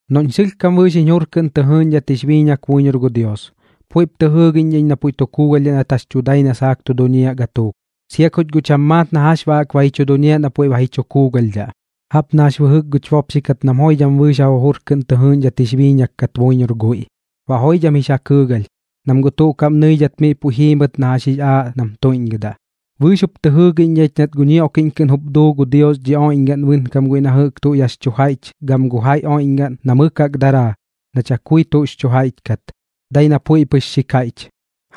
Noꞌñ sɨlhkam bɨɨx jiñ jur kɨꞌn tɨ jɨɨꞌñdhat jix biiñak buiñor gu Dios, puiꞌp tɨ jɨɨgiꞌñdhaꞌ iñ na puiꞌ tu kuugalhdhaꞌ nat jax tu dai na saak tu duñiaꞌ gatuuk, sia kuch guꞌ cham maat na jax baꞌ jaꞌk ba ji chu duñiaꞌ na puiꞌ ba ji chu kuugalhdhaꞌ. Jaꞌp na jax bɨjɨk guch bopxi kat nam joidham bɨɨx ja jujur kɨꞌn tɨ jɨɨꞌñdhat jix biiñak kat buiñor guiꞌ, baꞌ joidham jix ja kɨɨgalh, nam guꞌ tuꞌ kaꞌm nɨidhat miꞌ puiꞌ jiimɨt na jax jix aaꞌ nam tuiꞌñgɨdaꞌ. Bɨɨx jup tɨ jɨɨgiꞌñ ich nat gu ñioꞌkiꞌñ kɨꞌn jup duu gu Dios dhi oiꞌñgaꞌn bɨnkam guiꞌ na jɨꞌk tuꞌ yax chu jaiꞌch gam gu jaiꞌ oiꞌñgaꞌn na mɨk jaꞌk daraa, na chakui tuꞌx chu jaiꞌch kat, dai na puiꞌ pɨx xi kaiꞌch.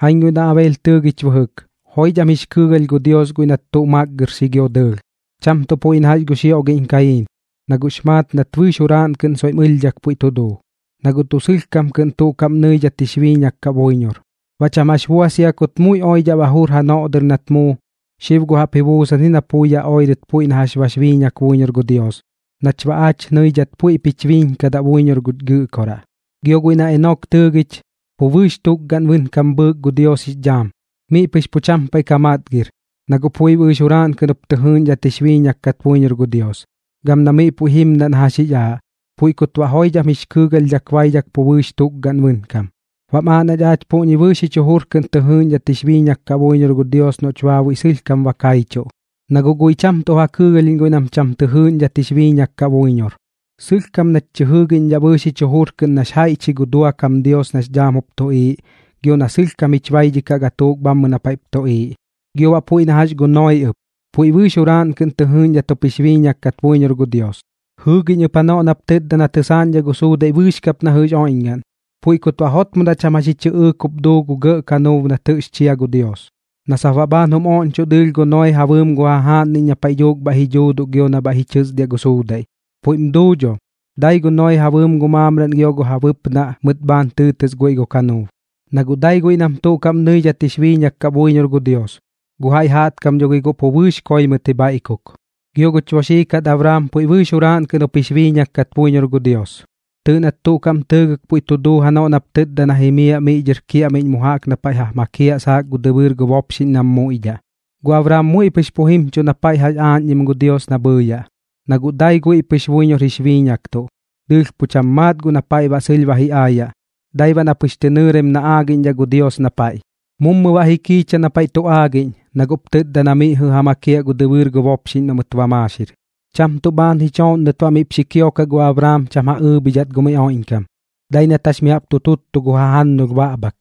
Jaiñ guiꞌ na Abeel tɨɨgich bɨjɨk, joidham jix kɨɨgalh gu Dios guiꞌ nat tuꞌ makgɨrxi gio dɨɨlh, cham tuꞌ puiꞌ na gu xioꞌgiꞌñ Kayiin, na guꞌx maat nat bɨɨx juraaꞌn kɨꞌn soiꞌm ɨlhdhak puiꞌ tu duu, na guꞌ tuꞌ sɨlhkam kɨꞌn tuꞌ kaꞌm nɨidhat jix biiñak kaꞌ buiñor. Baꞌ cham jax bua sia kut muiꞌ oidhaꞌ ba jur janoꞌ dɨr nat muu, xib guꞌ jaꞌp ji buusan ji na pui yaꞌ oirɨt puiꞌ na jax bax biiñak buiñor gu Dios, nach baꞌ aach nɨidhat puiꞌp jich biiñkadaꞌ buiñor guch Gɨꞌkoraꞌ. Gio guiꞌ na Enok tɨɨgich, pu bɨɨx tukgaꞌn bɨnkam bhɨɨk gu Dios jix dhaam, miꞌ pɨx pu cham paiꞌ ka matgir, na guꞌ puiꞌ bɨɨx juraaꞌn kɨꞌn jup tɨ jɨɨꞌñdhat jix biiñak kat buiñor gu Dios, gam na miꞌ puiꞌ jimdaꞌ na jax jix aaꞌ, puiꞌ kut baꞌ joidham jix kɨɨgalhdhak baidhak pu bɨɨx tukgaꞌn bɨnkam. Baꞌm aaꞌ nach aach puꞌñi bɨɨx jich jujur kɨꞌn tɨ jɨɨꞌñdhat jix biiñak kaꞌ buiñor gu Dios noꞌch baabuiꞌ sɨlhkam ba kaichuꞌ, na guꞌ guiꞌ cham tuꞌ ja kɨɨgalhiꞌñ guiꞌ nam cham tɨ jɨɨꞌñdhat jix biiñak kaꞌ buiñor. Sɨlhkam nach tɨ jɨɨgiꞌñdhaꞌ bɨɨx jich jujur kɨꞌn nax jaiꞌch ji gu duakam Dios nax dhaam jup tuꞌiiꞌ, gio na sɨlhkam jich baidhikaꞌ gatuuk bhammɨ na paiꞌp tuꞌiiꞌ. Gio baꞌ puiꞌ na jax gu Noee ɨp, puiꞌ bɨɨx juraaꞌn kɨꞌn tɨ jɨɨꞌñdhat jup jix biiñak kat buiñor gu Dios. Jɨɨgiꞌñ ɨp janoꞌ nap tɨtda na tɨsaaꞌñdhaꞌ gu suudaiꞌ bɨɨx kap na jɨꞌx oiꞌñgaꞌn, puiꞌ kut baꞌ jotmodaꞌ cham jax ji chɨꞌɨɨk jup duu gu gɇꞌ kanuub nat jɨꞌx chia gu Dios, na sap baꞌ bhaan jum oꞌñchoꞌ dɨɨlh gu Noee ja bɨɨm gu jajaaꞌnniꞌñ na paiꞌ dhuuk bhaiꞌ ji dhuuduꞌ gio na bhaiꞌ ji chɨsdiaꞌ gu suudaiꞌ. Puiꞌm duu dho, dai gu Noee ja bɨɨm gu maamraꞌn gio gu ja bɨpnaꞌ mɨt bhaan tɨɨtɨs guiꞌ gu kanuub, na guꞌ dai guiꞌ nam tuꞌ kaꞌm nɨidhat jix biiñak kaꞌ buiñor gu Dios, gu jaiꞌ jaꞌtkam dho gi guꞌ pu bɨɨx koi mɨt ji bhaiꞌkok. Gio guch boxii kat Abraam puiꞌ bɨɨx juraaꞌn kɨꞌn jup jix biiñak kat buiñor gu Dios. Tɨɨꞌ nat tuꞌ kaꞌm tɨɨgɨk puiꞌ tu duu janoꞌ nap tɨtda na jimiaꞌ miꞌ dhɨr kiaꞌmiꞌñ mu jaꞌk na paiꞌ ja makiaꞌ saak gu dɨbɨɨr gu bopxiꞌñ nam muiꞌdhaꞌ. Gu Abraam muiꞌ pɨx pu jimchuꞌ na paiꞌ jaꞌk aaꞌñdhim gu Dios na bhɨɨyaꞌ, na guꞌ dai guiꞌ pɨx buiñor jix biiñaktuꞌ, dɨɨlh pu cham maat guꞌ na paiꞌ baꞌ sɨlh ba ji aayaꞌ, dai baꞌ na pɨx tɨ nɨɨraim na aagiꞌñdhaꞌ gu Dios na paiꞌ. Mummu baꞌ ji kiicha na paiꞌ tu aagiꞌñ, na guꞌp tɨtda na miꞌ jɨꞌ ja makiaꞌ gu dɨbɨɨr gu bopxiꞌñ noꞌ mɨt ba maaxir. Cham tuꞌ bhaan ji chooꞌnnɨt baꞌ miꞌp xi kiokaꞌ gu Abraam cham ja ɨɨbhidhat gu miꞌ oiꞌñkam, dai nat jax mi jaꞌp tu tuttu gu jajannulh baꞌbhak,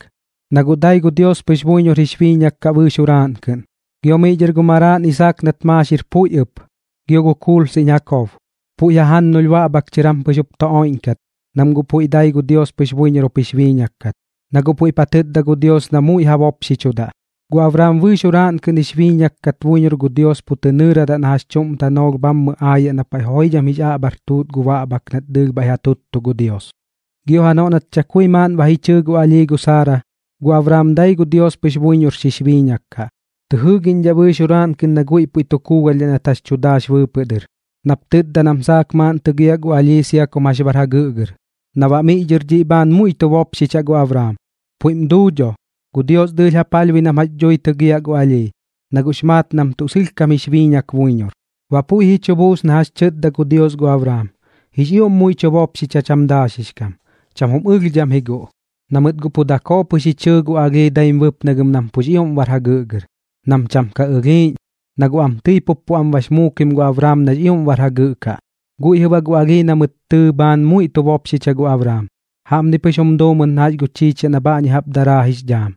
na guꞌ dai gu Dios pɨx buiñor jix biiñak kaꞌ bɨɨx juraaꞌn kɨꞌn. Gio miꞌ dhɨr gu maraaꞌn Isaak nat maaxir puiꞌ ɨp, gio gu kuulsiꞌñ Jakob, puiꞌ jajannulh baꞌbhak chɨr jam pɨx jup tu oiꞌñkat, nam guꞌ puiꞌ dai gu Dios buiñor jup jix biiñak kat, na guꞌ puiꞌp ja tɨtda gu Dios na muiꞌ ja bopxichudaꞌ. Gu Abraam bɨɨx juraaꞌn kɨꞌn jix biiñak kat buiñor gu Dios pu tɨ nɨɨradaꞌ na jax chuꞌm tanoolh bhammɨ aayaꞌ na paiꞌ joidham jix aꞌbhar tuut gu baꞌbhak nat dɨɨlh bhaiꞌ ja tuttu gu Dios. Gio janoꞌ nat chakui maaꞌn ba ji chɨɨ gu alhii gu Saara, gu Abraam dai gu Dios pɨx buiñor xix biiñak kaꞌ, tɨ jɨɨgiꞌñdhaꞌ bɨɨx juraaꞌn kɨꞌn na guiꞌ puiꞌ tu kuugalhdhaꞌ nat jax tu daax bɨɨpɨꞌ dɨr, nap tɨtda nam saak maaꞌn tɨgiaꞌ gu alhii sia kum jax bar jagɨꞌgɨr, na baꞌ miꞌ dhɨr dhiꞌ bhaan muiꞌ tu bopxichaꞌ gu Abraam. Puiꞌm duu dho, gu Dios dɨɨlh ja palhbui nam jax dhui tɨgiaꞌ gu alhii, na guꞌx maat nam tuꞌ sɨlhkam jix biiñak buiñor. Baꞌ puiꞌ ji chu buus na jax tɨtda gu Dios gu Abraam, jix ioꞌm muiꞌ tu bopxicha cham daaxix kam, cham jum ɨlhdham ji guꞌ, na mɨt guꞌ dakoo pɨx ji chɨɨ gu alhii daim bɨpnagɨm nam pux ioꞌm bar jagɨꞌgɨr, nam cham ka ɨlhiiꞌñ, na guꞌ am tɨi pup pu am bax muukim gu Abraam nax ioꞌm bar jagɨꞌ kaꞌ. Guiꞌ jɨꞌ baꞌ gu alhii na mɨt tɨɨ bhaan muiꞌ tu bopxicha gu Abraam, jaꞌpni pɨx jum duu mɨt na gu chiichiaꞌ na bhaꞌñi jaꞌp daraa jix dhaam,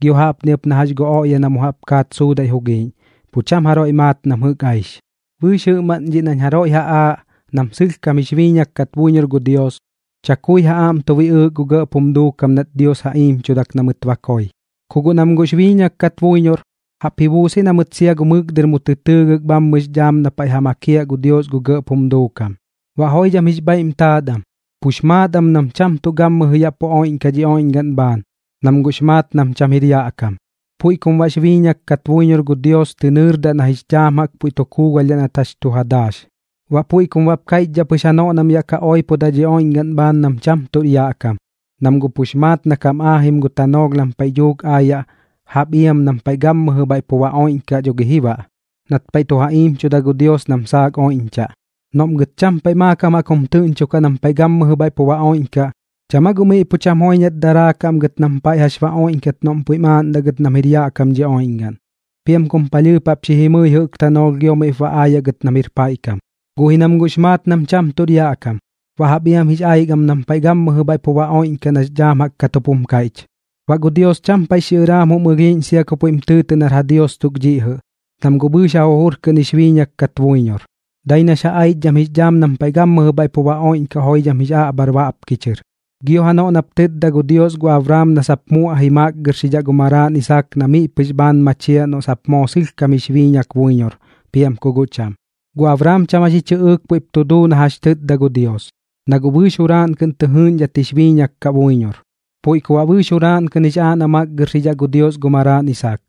gio jaꞌpni ɨp na jax gu oꞌya na mu jaꞌp kaat suudaiꞌ jugiiꞌñ. Pu cham jaroiꞌ maat nam jɨꞌk aix. Bɨɨx jɨꞌmaꞌn dhiꞌ nañ jaroiꞌ ja aaꞌ nam tuꞌ sɨlhkam jix biiñak kat buiñor gu Dios, chakui ja aꞌm tu biꞌɨɨk gu gɇꞌp jum duukam nat Dios ja iimchudak na mɨt koi. Ku guꞌ nam guꞌx biiñak kat buiñor, jaꞌp ji buus ji na mɨt sia gu mɨk dɨr mu tɨ tɨɨgɨk bhammɨ jix dhaam na paiꞌ ja makiaꞌ gu Dios gu gɇꞌp jum duukam. Baꞌ joidham jix bhaiꞌm taat am, pux maat am nam cham tuꞌ gammɨjɨ yaꞌ pu oiꞌñkaꞌ dhi oiꞌñgaꞌn bhaan, nam guꞌx maat nam cham jir yaꞌ kam. Puiꞌ kum baꞌx biiñak kat buiñor gu Dios tɨ nɨɨrdaꞌ na jix dhaam jaꞌk puiꞌ tu kuugalhdhaꞌ nat jax tu ja daax. Baꞌ puiꞌ kum baꞌp kaiꞌchdhaꞌ pɨx janoꞌ nam yaꞌ ka oipodaꞌ dhi oiꞌñgaꞌn bhaan nam cham tuꞌr yaꞌ kam, nam guꞌ pux maat na kam aajim gu tanoolh nam paiꞌ dhuuk aayaꞌ jaꞌp iam nam paiꞌ gammɨjɨ bhaiꞌ pu ba oiꞌñkaꞌ dho gi ji baꞌ, nat paiꞌ tu ja iimchuda gu Dios nam saak oiꞌñchaꞌ. Noꞌm gɨt cham paiꞌ maakam jaꞌk jum tɨꞌñchokaꞌ nam paiꞌ gammɨjɨ bhaiꞌ pu ba oiꞌñkaꞌ, ¿cham aa guꞌ miꞌ pu cham joiñat daraakaꞌ am gɨt nam paiꞌ jax ba oiꞌñkat noꞌm puiꞌm aaꞌndaꞌ gɨt nam jir yaꞌ kam dhi oiꞌñgaꞌn? Piam kum palhɨɨp jaꞌp xi jimɨi jɨꞌk tanoolh gio mup ba aayaꞌ gɨt nam jir paiꞌ kam. Guꞌ ji nam guꞌx maat nam cham tuꞌr yaꞌ kam, baꞌ jaꞌp jaꞌk jix aik am nam paiꞌ gammɨjɨ bhaiꞌ pu ba oiꞌñkaꞌ nax dhaam jaꞌk kat jup jum kaiꞌch. Baꞌ gu Dios cham paiꞌx xiꞌɨraam jum ɨlhiiꞌñ sia ku puiꞌm tɨɨtɨꞌ nar ja Dios tuk dhiꞌ jɨꞌ, nam guꞌ bɨɨx ja jujur kɨꞌn jix biiñak kat buiñor, dai nax ja aichdham jix dhaam nam paiꞌ gammɨjɨ bhaiꞌ pu ba oiꞌñkaꞌ joidham jix aꞌbhar baꞌpki chɨr. Gio janoꞌ nap tɨtda gu Dios gu Abraam na sap muaꞌji makgɨrxidhaꞌ gu maraaꞌn Isaak na miꞌ pɨx bhaan machiaꞌ noꞌ sap moo sɨlhkam jix biiñak buiñor piam ku guꞌ cham, gu Abraam cham jax ji chɨꞌɨɨk puiꞌp tu duu na jax tɨtda gu Dios, na guꞌ bɨɨx juraaꞌn kɨꞌn tɨ jɨɨꞌñdhat jix biiñak kaꞌ buiñor. Puiꞌ ku baꞌ bɨɨx juraaꞌn kɨꞌn jix aaꞌ na makgɨrxidhaꞌ gu Dios gu maraaꞌn Isaak,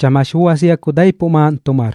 cham jax bua sia ku daipuꞌ maaꞌn tu mar,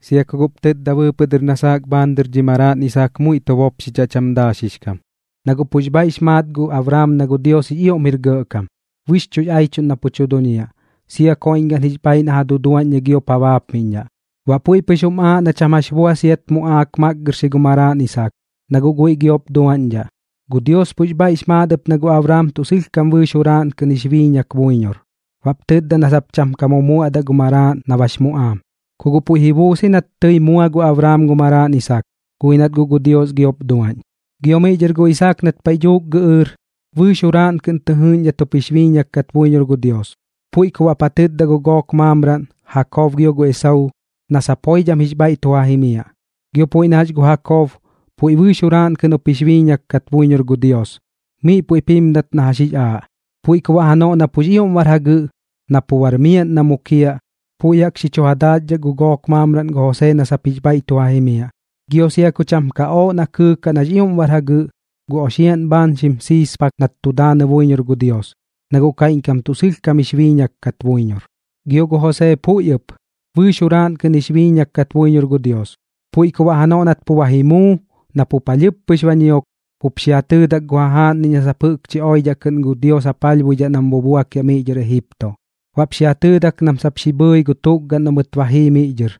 sia ku guꞌp tɨtda bɨɨpɨꞌ dɨr na saak bhaan dhiꞌ dhi maraaꞌn Isaak muiꞌ tu bopxichaꞌ cham daaxix kam. Na guꞌ pux bhaiꞌx maat gu Abraam na gu Dios jix ioꞌm jir gɇꞌkam, bɨxchuꞌx aichuꞌn na pu tu duñiaꞌ, sia koiꞌñgaꞌn jix bhaaiꞌ na ja duduaꞌñdhai giop ja baapmiꞌñdhaꞌ. Baꞌ puiꞌ pɨx jum aaꞌ na cham jax bua siat muꞌaak makgɨrxi gu maraaꞌn Isaak, na guꞌ guiꞌ giop duaꞌñdhaꞌ. Gu Dios pux bhaiꞌx maat ɨp na gu Abraam tuꞌ sɨlhkam bɨɨx juraaꞌn kɨꞌn jix biiñak buiñor, baꞌp tɨtda na sap cham ka mumuaꞌdaꞌ gu maraaꞌn na bax muꞌaam. Ku guꞌ puiꞌ ji buus ji nat tɨi mua gu Abraam gu maraaꞌn Isaak, guꞌ ji nat guꞌ gu Dios giop duaꞌñ. Gio miꞌ dhɨr gu Isaak nat paiꞌ dhuuk gɨꞌɨɨr, bɨɨx juraaꞌn kɨꞌn tɨ jɨɨꞌñdhat jup jix biiñak kat buiñor gu Dios, puiꞌ ku baꞌp ja tɨtda gu gook maamraꞌn, Jakob gio Esauu, na sap joidham jix bhaiꞌ tu ja jimiaꞌ. Gio puiꞌ na jax gu Jakob, puiꞌ bɨɨx juraaꞌn kɨꞌn jup jix biiñak kat buiñor gu Dios, miꞌ puiꞌp jimdat na jax jix aaꞌ. Puiꞌ ku baꞌ janoꞌ na pux ioꞌm bar jagɨꞌ, na pu bar miaꞌn na mukiaꞌ, puiꞌ jaꞌk xi chu ja daaxdhak gu gook maamraꞌn gu Josee na sap jix bhaiꞌ tu ja jimiaꞌ. Gio sia ku cham ka ooꞌ na kɨɨkaꞌ nax ioꞌm bar jagɨꞌ, gu oxiaꞌn bhaan xim siispak nat tu daanɨ buiñor gu Dios, na guꞌ kaiꞌñkam tuꞌ sɨlhkam jix biiñak kat buiñor. Gio gu Josee puiꞌ ɨp, bɨɨx juraaꞌn kɨꞌn jix biiñak kat buiñor gu Dios. Puiꞌ ku baꞌ janoꞌ nat pu ba ji muu, na pu palhɨɨp pɨx ba ñiok, jup xi ja tɨɨdak gu jajaaꞌnniꞌñ na sap jɨꞌkchi oidhaꞌ kɨꞌn gu Dios ja palhbuidhaꞌ nam bubuakiaꞌ miꞌ dhɨr Ejipto. Baꞌp xi ja tɨɨdak nam sap xi bhɨɨji gu tukgaꞌn noꞌ mɨt ba jii miꞌ dhɨr,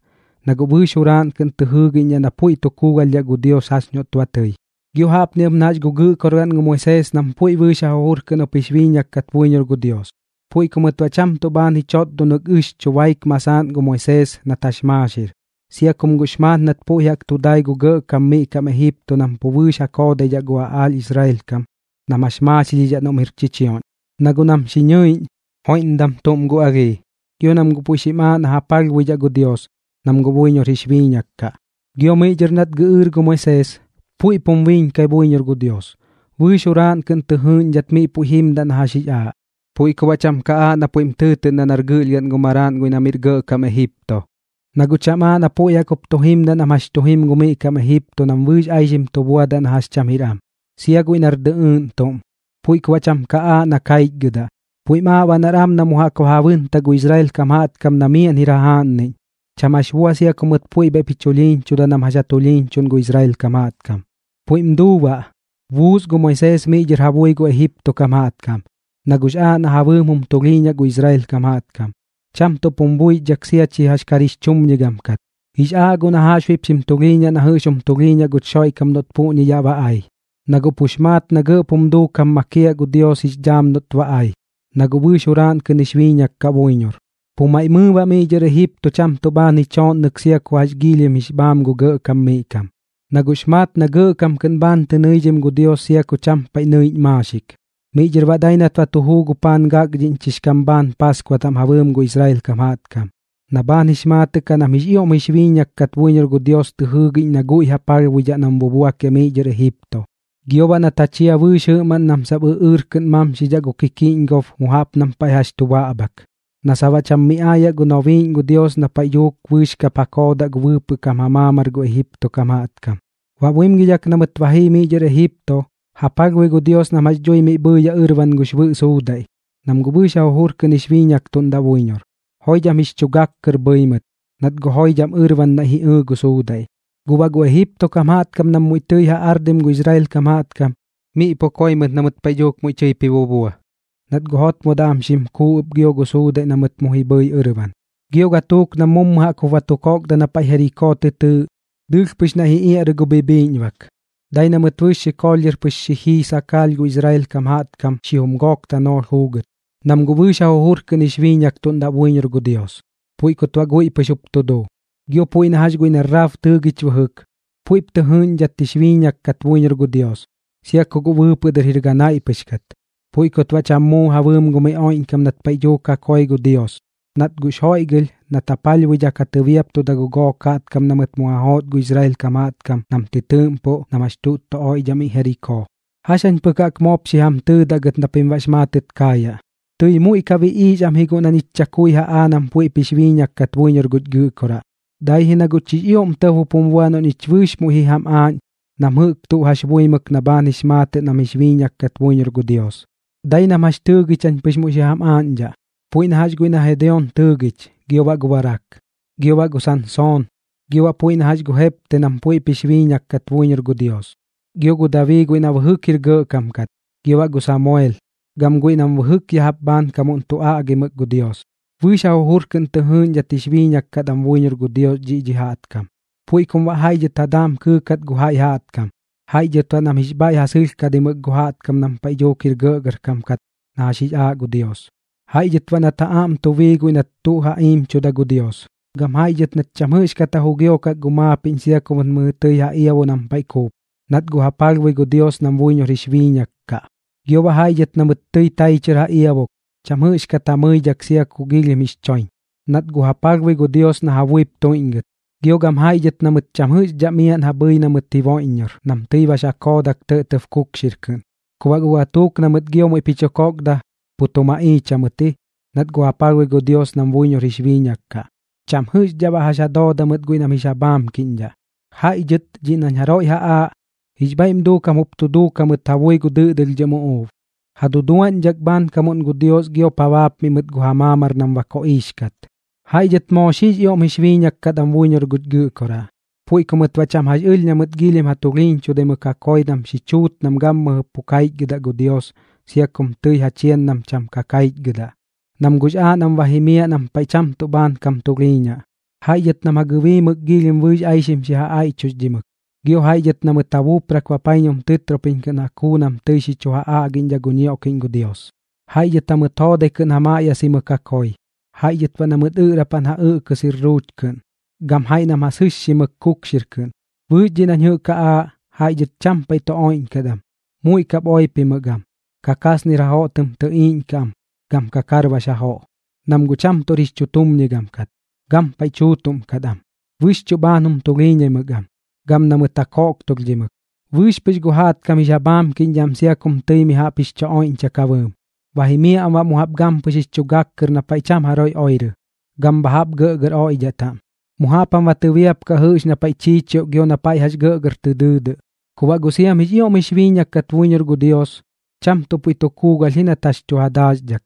na guꞌ bɨɨx juraaꞌn kɨꞌn tɨ jɨɨgiꞌñdhaꞌ na puiꞌ tu kuugalhdhaꞌ gu Dios jax noꞌt ba tɨi. Gio jaꞌpni ɨp na jax gu gɨꞌkorgaꞌn gu Moisees nam puiꞌ bɨɨx ja jujur kɨꞌn jup jix biiñak kat buiñor gu Dios. Puiꞌ ku mɨt baꞌ cham tuꞌ bhaan ji chotdonɨk ɨxchu baik masaaꞌn gu Moisees nat jax maaxir, sia kum guꞌx maat nat puiꞌ jaꞌk tu dai gu gɇꞌkam miꞌ kam Ejipto nam pu bɨɨx ja koodaidhaꞌ gu aꞌaalh Israel kam nam jax maaxilhidhaꞌ noꞌm jir chichioꞌñ. Na guꞌ nam xi ñɨiꞌñ, joiꞌmdam tuꞌm gu alhii, gio nam guꞌ puiꞌ pɨx xim aaꞌ na ja palhbuidhaꞌ gu Dios, nam guꞌ buiñor jix biiñak kaꞌ. Gio miꞌ dhɨr nat gɨꞌɨɨr gu Moisees, puiꞌp jum biiñkai buiñor gu Dios, bɨɨx juraaꞌn kɨꞌn tɨ jɨɨꞌñdhat miꞌ puiꞌ jimdaꞌ na jax jix aaꞌ. Puiꞌ ku baꞌ cham ka aaꞌ na pui puiꞌm tɨɨtɨꞌndaꞌ nar gɨꞌlhgaꞌn gu maraaꞌn guiꞌ na miꞌr gɇꞌkam Ejipto. Na guꞌ cham aaꞌ na puiꞌ jaꞌk jup tu jimdaꞌ nam jax tu jim gu miꞌ kam Ejipto nam bɨɨx aixim tu buadaꞌ na jax cham jir am, sia guiꞌ nar dɨꞌɨɨꞌn tuꞌm, puiꞌ ku baꞌ cham ka aaꞌ na kaichgɨdaꞌ. Puiꞌm aaꞌ baꞌ nar am na mu jaꞌk ba ja bɨntaꞌ gu Israel kam jaꞌtkam na miaꞌn jir jajaaꞌnniꞌñ, cham jax bua sia ku mɨt puiꞌ bhaiꞌp ji chulhiiñchuda nam jax ja tulhiiñchuꞌndaꞌ gu Israel kam jaꞌtkam. Puiꞌm duu baꞌ, buus gu Moisees miꞌ dhɨr ja bui gu Ejipto kam jaꞌtkam, na guꞌx aaꞌ na ja bɨɨm jum tulhiiñaꞌ gu Israel kam jaꞌtkam, cham tuꞌp jum buixdhak sia chi jax kar jix chumñigam kat. Jix aaꞌ guꞌ na jaꞌxbuiꞌp xim tulhiiñaꞌ na jɨꞌx jum tulhiiñaꞌ guch Xoiꞌkam noꞌt puꞌñi yaꞌ ba ai, na guꞌ pux maat na gɇꞌp jum duukam makiaꞌ gu Dios jix dhaam noꞌt ba ai, na guꞌ bɨɨx juraaꞌn kɨꞌn jix biiñak kaꞌ buiñor. Pu maiꞌ mɨɨ baꞌ miꞌ dhɨr Ejipto cham tuꞌ bhaan ji chooꞌnnɨk sia ku jax giilhim jix bhaam gu gɇꞌkam miꞌ kam, na guꞌx maat na gɇꞌkam kɨꞌn bhaan tɨ nɨidhim gu Dios sia ku cham paiꞌ nɨiꞌñ maaxik. Miꞌ dhɨr baꞌ dai nat ba tu juu gu paan gakdhiꞌñchix kam bhaan Paaskua taꞌm ja bɨɨm gu Israel kam jaꞌtkam, na bhaan jix maatɨꞌ kaꞌ nam jix ioꞌm jix biiñak kat buiñor gu Dios tɨ jɨɨgiꞌñ na guiꞌ ja palhbuidhaꞌ nam bubuakiaꞌ miꞌ dhɨr Ejipto. Gio baꞌ nat ja chia bɨɨx jɨꞌmaꞌn nam sap ɨꞌɨɨr kɨꞌn mamxidhaꞌ gu kikiꞌñgob mu jaꞌp nam paiꞌ jax chu baꞌbhak, na sap baꞌ cham miꞌ aayaꞌ gu nobiiꞌñ gu Dios na paiꞌ dhuuk bɨɨx kap ja koodaꞌ gu bɨɨpɨꞌ kam ja maamar gu Ejipto kam jaꞌtkam. Baꞌ buimgidhak na mɨt ba jii miꞌ dhɨr Ejipto, ja palhbui gu Dios nam jax dhui miꞌ bhɨɨyaꞌ ɨrban gux Bɨꞌ Suudaiꞌ, nam guꞌ bɨɨx ja jujur kɨꞌn jix biiñaktuꞌndaꞌ buiñor. Joidham jix chu gak kɨr bhɨi mɨt, nat guꞌ joidham ɨrban naiꞌ ji ɨɨ gu suudaiꞌ. Guꞌ baꞌ gu Ejipto kam jaꞌtkam nam muiꞌ tɨi ja ardim gu Israel kam jaꞌtkam, miꞌ pu koi mɨt na mɨt paiꞌ dhuuk muiꞌ tɨip ji bubua, nat guꞌ jotmodaꞌ am xim kuu ɨp gio gu suudaiꞌ na mɨt mu ji bhɨi ɨrban. Gio gatuuk nam mummu jaꞌk jup ba tu kokda na paiꞌ Jerikoo tɨ tɨɨꞌ, dɨɨlh pɨx naiꞌ ji iaꞌrɨ gu bhibhiiꞌñbak, dai na mɨt bɨɨx xikoolh dhɨr pɨx xi jii sakaalh gu Israel kam jaꞌtkam xijum gook tanoolh juugɨt, nam guꞌ bɨɨx ja jujur kɨꞌn jix biiñaktuꞌndaꞌ buiñor gu Dios, puiꞌ kut baꞌ guiꞌ pɨx jup tu duu. Gio puiꞌ na jax guiꞌ na Raab tɨɨgich bɨjɨk, puiꞌp tɨ jɨɨꞌñdhat jix biiñak kat buiñor gu Dios, sia ku guꞌ bɨɨpɨꞌ dɨr jir ganaiꞌ pɨx kat. Puiꞌ kut baꞌ cham muu ja bɨɨm gu miꞌ oiꞌñkam nat paiꞌ dhuuk ja koi gu Dios, nat guꞌx joiꞌgɨlh nat ja palhbuidhak ja tɨbiaptuda gu gook jaꞌtkam na mɨt mu ja joot gu Israel kam jaꞌtkam nam tɨ tɨɨꞌmpuꞌ nam jax tuꞌt tu oiꞌdhaꞌ miꞌ Jerikoo. ¿Jax jañ pɨk jaꞌk moop xi jam tɨɨdaꞌ gɨt na pim baꞌx maatɨt kaayaꞌ? Tɨi muiꞌ ka biꞌiix am ji guꞌ na ñich chakui ja aa nam puiꞌp jix biiñak kat buiñor guch Gɨꞌkoraꞌ, dai ji na guꞌ chix ioꞌm tɇb jup jum bua noꞌ ñich bɨɨx muiꞌ ji jam aaꞌñ nam jɨꞌk jax tu buimɨk na bhaan jix maatɨꞌ nam jix biiñak kat buiñor gu Dios. Dai nam jax tɨɨgich jañ pɨx muiꞌ xi jam aaꞌñdhaꞌ, puiꞌ na jax guiꞌ na Gedeon tɨɨgich, gio baꞌ gu Barak, gio baꞌ gu Sansoon, gio baꞌ puiꞌ na jax gu Jepte nam puiꞌp jix biiñak kat buiñor gu Dios. Gio gu Dabii guiꞌ na bɨjɨk jir gɇꞌkam kat, gio baꞌ gu Samuel, gam guiꞌ nam bɨjɨk ya jaꞌp bhaankamuꞌn tu aꞌgimɨk gu Dios. Bɨɨx ja jujur kɨꞌn tɨ jɨɨꞌñdhat jix biiñak kat am buiñor gu Dios dhiꞌ dhi jaꞌtkam, puiꞌ kum baꞌ jaiꞌ dhɨt ja daam kɨɨkat gu jaiꞌ jaꞌtkam, jaiꞌ dhɨt baꞌ nam jix bhaiꞌ ja sɨlhkadimɨk gu jaꞌtkam nam paiꞌ dhuuk jir gɇꞌgɇrkam kat na jax jix aaꞌ gu Dios. Jaiꞌ dhɨt baꞌ nat ja aꞌm tu bii guiꞌ nat tuꞌ tu ja iimchuda gu Dios. Gam jaiꞌ dhɨt nat cham jɨꞌxdhat ja jugiokak gu maapiꞌñ sia ku mɨt mɨjɨ tɨi ja iabo nam paiꞌ kuup, nat guꞌ ja palhbui gu Dios nam buiñor jix biiñak kaꞌ. Gio baꞌ jaiꞌ dhɨt na mɨt tɨi tai chɨr ja iabok, cham jɨꞌxdhat ja mɨidhak sia ku giilhim jix choiñ, nat guꞌ ja palhbui gu Dios na ja buip tuiꞌñgɨt. Gio gam jaiꞌ dhɨt na mɨt cham jɨꞌxdhaꞌ miaꞌn ja bhɨi na mɨt jiboiꞌññor nam tɨi bax ja koodak tɇꞌtɇb kukxir kɨꞌn. Ku baꞌ guꞌ gatuuk na mɨt gio muiꞌp ji chu kokda, pu tu maꞌiich jamɨt ji, nat guꞌ ja palhbui gu Dios nam buiñor jix biiñak kaꞌ. Cham jɨꞌxdhaꞌ baꞌ jax ja dooda mɨt guiꞌ nam jix ja bhaamkiꞌñdhaꞌ. Jaiꞌ dhɨt dhiꞌ nañ jaroiꞌ ja aaꞌ, jix bhaiꞌm duukam jup tu duuk jamɨt ja bui gu dɨꞌdɨlhdhɨm uꞌuub, ja duduaꞌñdhak bhaankamuꞌn gu Dios giop ja baapmiꞌ mɨt gu ja maamar nam ba koꞌiix kat. Jaiꞌ dhɨt moo xiꞌx ioꞌm jix biiñak kat am buiñor guch Gɨꞌkoraꞌ, puiꞌ ku mɨt baꞌ cham jax ɨlh na mɨt giilhim ja tulhiiñchudaimɨk ja koi nam xi chuut nam gammɨjɨ pu kaichgɨdaꞌ gu Dios sia kum tɨi ja chian nam sap cham ka kaichgɨdaꞌ, nam guꞌx aaꞌ nam ba jimiaꞌ nam paiꞌ cham tuꞌ bhaan kam tulhiiñaꞌ. Jaiꞌ dhɨt nam ja gɨbiimɨk giilhim bɨɨx aixim xi ja aiꞌchuxdhimɨk, gio jaiꞌ dhɨt na mɨt ja buuprak bapaiñum tɨtropiñ kɨꞌn ja kuu nam tɨi xi chu ja aꞌgiꞌñdhaꞌ gu ñioꞌkiꞌñ gu Dios. Jaiꞌ dhɨt jamɨt joodai kɨꞌn ja maꞌyasimɨk ja koi, jaiꞌ dhɨt baꞌ na mɨt ɨꞌrapan ja ɨꞌkɨ sirruuch kɨꞌn, gam jaiꞌ dhɨt nam ja sɨxximɨk kukxir kɨꞌn. Bɨɨx dhiꞌ nañ jɨꞌk ja aaꞌ, jaiꞌ dhɨt cham paiꞌ tu oiꞌñkat am, muiꞌ kap oipimɨk am, kakasnir jajoꞌ tɨm tɨꞌiiꞌñkaꞌ am gam kakarbax jajooꞌ, nam guꞌ cham tuꞌr jix chutumñigam kat, gampaiꞌ tuutuꞌm kat am. Bɨxchuꞌ bhaan jum tulhiiñaimɨk am, gam na mɨt ja koꞌktulhdhimɨk. Bɨɨx pɨx gu jaꞌtkam jix ja bhaamkiꞌñdhaꞌ am sia kum tɨi mi jaꞌp jix chu oiꞌñchak ja bɨɨm. Ba jimiaꞌ am baꞌ mu jaꞌp gampɨx jix chu gak kɨr na paiꞌ cham jaroiꞌ oirɨ, gam bha jaꞌp gɇꞌgɇr oiꞌdhaꞌ taꞌm. Mu jaꞌp jam ba tɨbiapkaꞌ jɨꞌx na paiꞌ chiichioꞌ gio na paiꞌ jax gɇgɇr tɨ dɨɨdɨꞌ. Ku baꞌ guꞌ siam jix ioꞌm jix biiñak kat buiñor gu Dios, cham tuꞌ puiꞌ tu kuugalh ji nat jax tu ja daaxdhak,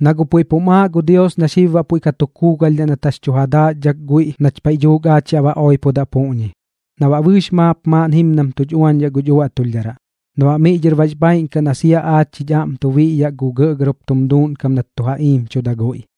na guꞌ puiꞌ pum aaꞌ gu Dios na xib baꞌ puiꞌ ka tu kuugalhdhaꞌ nat jax tu ja daaxdhak guiꞌ nach paiꞌ dhuuk aach yaꞌ ba oipodaꞌ puꞌñi, na baꞌ bɨɨx maap maaꞌn jimdam tuch uañdhaꞌ guch uaꞌtulhdharaꞌ, na baꞌ mɨꞌ dhɨr bax bhaaiꞌn kaꞌ na sia aach jich aꞌm tu biꞌyaꞌ gu gɇꞌgɇr jup tum duuꞌnkam nat ja iimchuda guiꞌ.